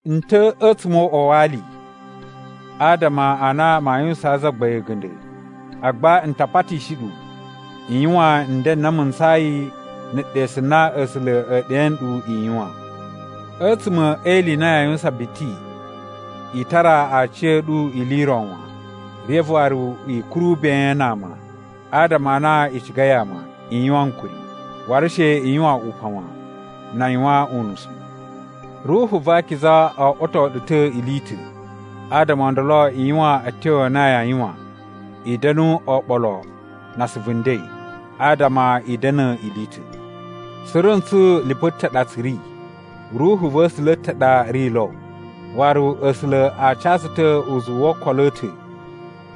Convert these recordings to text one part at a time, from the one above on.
N ta̱ a̱tsuma̱ o uꞌwa wa ali adama a na maa yuwusaan Zagbain a̱ga̱nda̱, agba n ta patishi ɗu i yuwan nden n na mu ntsayi na̱ ɗesu na A̱sula̱ e ɗe nɗu i yuwan. A̱tsuma̱ e ili i na yaa yuwusan biti, i tara aciya̱ɗu ili i ro wan, reve waru i kuru ben na ama. Adama a na i cigai ama, i yuwan ankuri, waru she i yuwan upan wan, na a yuwan unusu. Ruhu va Akiza oꞌwoto ɗu ta̱ ili i ta̱, adama o ndolo i yuwan a̱tyo a na yaa yuwan i da̱nu oɓolo na asuvu nden, adama i da̱na̱ ili i ta̱. Suru ntsu lipu ta̱ ɗa tsu ri. Ruhu va̱ A̱sula̱ ta̱ ɗa ri lo. Waru A̱sula̱ a ca tsu ta̱ uzuwu wo okolo a̱ ta̱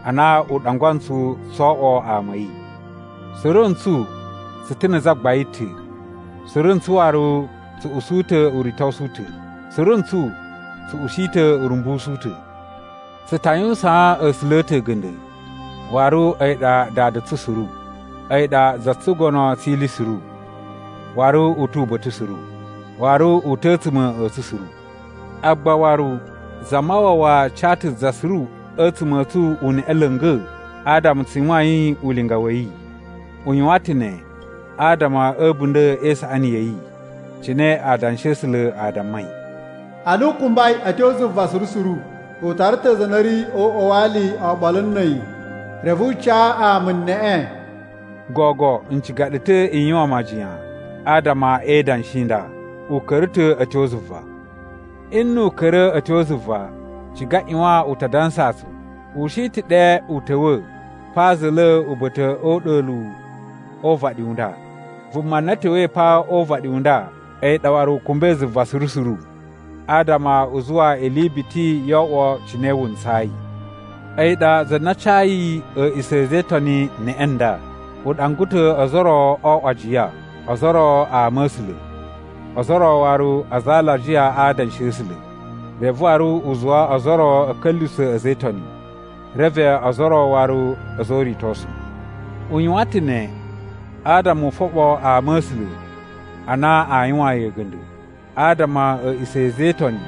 ana u ɗangwa ntsu tso oꞌwo ama a̱ yi. Suru ntsu tsu ta̱ na̱ Zagbain ta̱. Suru ntsu waru tsu usu ta̱ uritosu u ta̱. Suru ntsu tsu ushi ta̱ urumbusu u ta̱. Tsu ta yuwusaan A̱sula̱ a̱ ta̱ a̱ga̱nda̱, waru a̱yi ɗa Dada tsu suru. A̱yi ɗa za tsugono tsi ili suru, waru u tu uba̱ta̱ suru, waru u ta̱ a̱tsuma̱ a̱ tsu suru. Agba waru Zamawawa ca ta̱ za suru a̱tsuma̱ a̱ tsu uneꞌe la̱nga̱ adama tsu yuwain ulinga wa̱ yi. U yuwan ta̱ ne adama a̱ a̱bunda̱ e isaꞌani ya̱ yi. Cine Adanshi a̱ A̱sula̱ a dammai, “Ana u kumbai a̱ tyo zuva suru suru, u tara ta̱ aza a na a̱ ri o uꞌwa wa ali oɓolo na̱ a̱yi, reve u ca ama neꞌe.” (Gogo n ciga ɗu ta̱ i yuwan majiyan adama e idanshi i nda, “u ka̱ra̱ ta̱ a̱ tyo zuva.” Nnu u ka̱ra̱ a̱ tyo zuva, ciga ꞌyuwan u ta dansa tsu, u shi ta̱ ɗe u ta̱wa̱ pa za̱la̱ uba̱ta̱ o uɗa̱luwu o uvaɗi u nda. Vuma na ta̱wa̱i pa o uvaɗi u nda a̱yi ɗa waru u kumbai zuva suru suru, adama u zuwa ili biti yo oꞌwo cine wu ntsayi.) A̱yi ɗa za na cayi a̱a̱ꞌisa̱ a̱ a̱za̱ e Itoni neꞌe nda: u ɗangwa ta̱ ozo o ro o oꞌwo ajiya, ozo o ro ama̱sula̱, ozo o ro waru aza a alajiya a adanshi a̱ A̱sula̱. Reve waru u zuwa ozo o ro a̱ ka̱lyuwusa̱ a̱za̱ e Itoni, reve ozo o ro waru a̱za̱ o uritosu. U yuwan ta̱ ne adama u foɓo ama a̱ A̱sula̱ a na aa yuwaan yi a̱ga̱nda̱, adama a̱a̱ꞌisa̱ a̱ a̱za̱ e Itoni,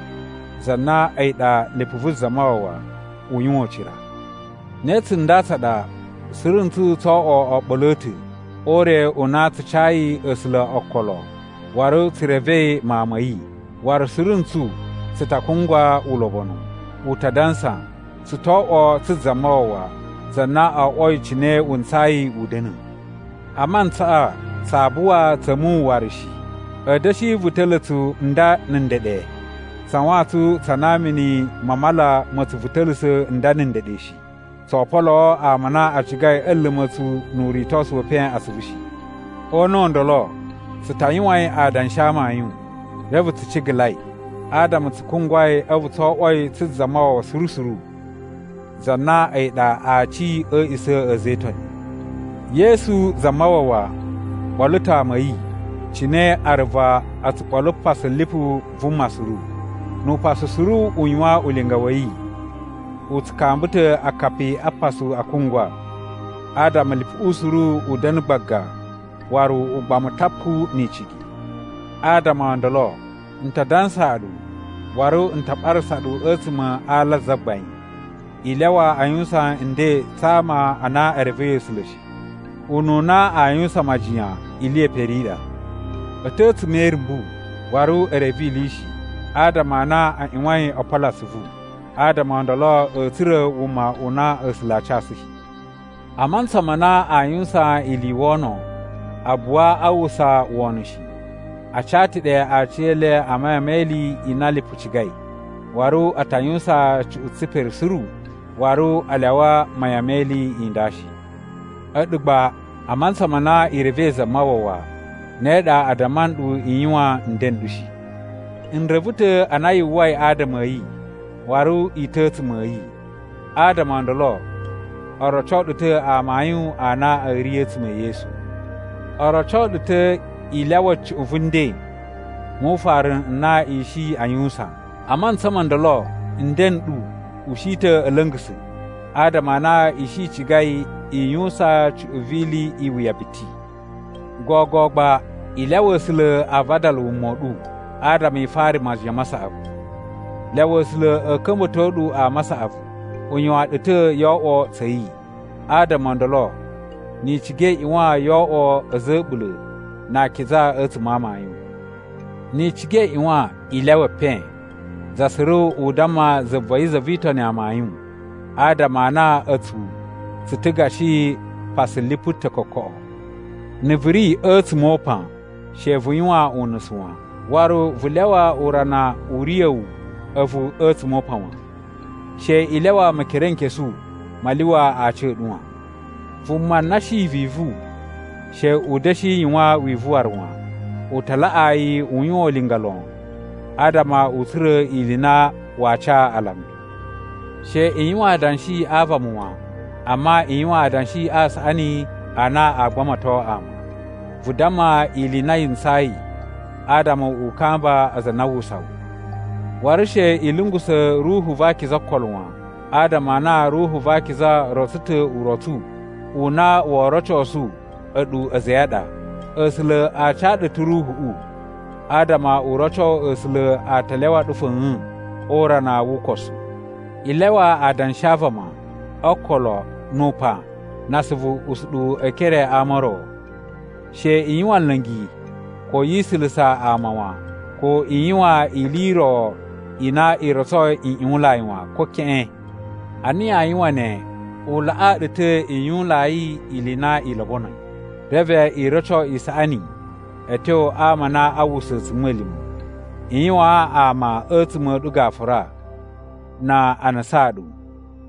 za na a̱yi ɗa lipu vu Zamawawa, u yuwan ucira. Ne tsunda tsa ɗa, suru ntsu tsoo oꞌwo oɓolo a̱ ta̱ o ure u na tsu cayi A̱sula̱ okolo waru tsu revei Mawun ma̱ yi, waru suru ntsu tsu ta kungwa ulobonu. U ta dansa, tsu to oꞌwo tsu Zamawawa, za na o oꞌwoi cine wu ntsayi u da̱na̱. A mantsaꞌa tsaa buwa tsa̱ muwun waru shi. A̱a̱ da̱shi vuta̱la̱ tsu nda na̱ ndeɗe tsa wantsun tsa na mini ma mala ma̱ tsu vuta̱la̱sa̱ nda na̱ ndeɗe shi. Tsoo poloo ama a na a cigai a̱ luma̱ tsu nu uritosu we epen atsuvu shi. O una̱ u ndolo, tsu ta yuwain adanshi a amayun, reve tsu cigalai, adama tsu kungwai a̱vu tso oꞌwoi tsu Zamawawa suru suru, za na a̱yi ɗa Aci a̱ a̱a̱ꞌisa̱ a̱ a̱za̱ e Itoni. Yesu Zamawawa ɓolo ta̱ ama a̱ yi, cine aruva o tsu ɓolo pasu lipu vuma suru. Nu upasu suru u yuwan ulinga wa̱ yi, u tsu kamba ta̱ akapi a pasu a kungwa, adama lipuꞌu suru u da̱na̱ gbaga waru ugbamu tapu ni icigi. Adama o ndolo, n ta dansaa ɗu, waru n ta ɓarasa ɗu a̱tsuma̱ a ala a Zagbain, i lyawa a yuwusan nden tsa ama a na e revei A̱sula̱ shi. Ununa aa yuwusan majiyan ili ye pere i ɗa. A̱ ta̱ a̱tsuma̱ e irumbu, waru e reve ili shi, adama a na a ꞌyuwain o polo atsuvu. Adama o ndolo a̱a̱ tsura̱ wuma u na A̱sula̱ aa casu shi. A mantsa ma na aa yuwusan ili i wono, a buwa a uwwusa wono shi. A ca ta̱ ɗe aciyele a mayan me ili i na lipu cigai, waru a ta yuwusan cuꞌun tsipere suru, waru a lyawa mayan me ili i nda shi. A̱ɗu gba, a mantsa ma na i revei Zamawawa, ne ɗa a damma nɗu i yuwan nden n ɗu shi. N reve ta̱ a na yu uwwai adama a̱ yi, waru i ta̱ a̱tsuma̱ a̱ yi, adama o ndolo o roco ɗu ta̱ amayun a na a̱ ri a̱tsuma̱ e Yesu. O roco ɗu ta̱ i lyawa cuꞌun vu nden mu ufaru n na i shi aa yuwusan. A mantsa mo ndolo nden n ɗu u shi ta̱ a̱ la̱nga̱sa̱ adama a na i shi i cigai i yuwusan cuꞌun vi ili i wuya biti. Gogo gba i lyawa A̱sula̱ a vadala wuma u ɗu adama i fara majiyan ma saꞌavu. Lyawa A̱sula̱ a̱ ka̱mba̱to ɗu ama a saꞌavu. U yuwan ɗu ta̱ yo oꞌwo tsa̱ yi, adama o ndolo ni i ciga i ꞌyuwan yo oꞌwo a̱za̱ a̱ a̱ɓula̱ na akiza a̱tsuma̱ a amayun. Ni i ciga i ꞌyuwan i lyawa epen. Za suru u damma za va̱ yi za vi Itoni amayun, adama a na a̱tsu tsu ta̱ gashi pasu lipu ta̱ kokoꞌo. Na̱ vu ri a̱tsuma̱ o upan, she vu yuwan unusu wan, waru vu lyawa urana u riya̱ wu a̱vu a̱tsuma̱ o upan wan. She i lyawa Mekerenkesu ma lyuwa aci a̱ ɗu wan. Vuma na shi vivu she u da̱shi yuwan wivu waru wan. U ta laꞌaa yi u yuwan ulinga lon adama u tsura̱ ili i na waa ca alambi. She i yuwan adanshi a vama wan, amma i yuwan adanshi a saꞌani a na aa gbamato ama. Vu damma ili i na yi ntsayi adama u kamba aza a na a uwwusa wu. Waru she i lungusa̱ Ruhu va Akiza okolo wan. Adama a na Ruhu va Akiza rotso ta̱ urotsu u na woo rocosu a̱ɗu a̱za̱ a̱ yi a ɗa. A̱sula̱ a ca ɗu ta̱ Ruhuꞌu adama u roco A̱sula̱ a ta lyawa ɗu fa̱a̱n o urana wu ukosu. I lyawa adanshi a vama o okolo nu upan na asuvu usuɗuwu e ekere a ama o ro. She i yuwan nla̱ngi ko yi isulusa ama wan, ko i yuwan ili i ro i na i rotsoi nꞌyuwunlai wan, ko keꞌen. Ana yaa yuwan ne, u laꞌaa ɗu ta̱ i yuwunlai ili i na i lobonoi, reve i roco isaꞌani a̱ tyo ama a na a uwwusa a̱tsuma̱lima̱. I yuwaan ama a̱tsuma̱ a̱ ɗu gafura na a nusaan ɗu,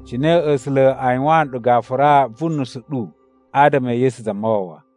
cine A̱sula̱ a yuwaan nɗu gafura vu nusu ɗu adama e Yesu Zamawawa.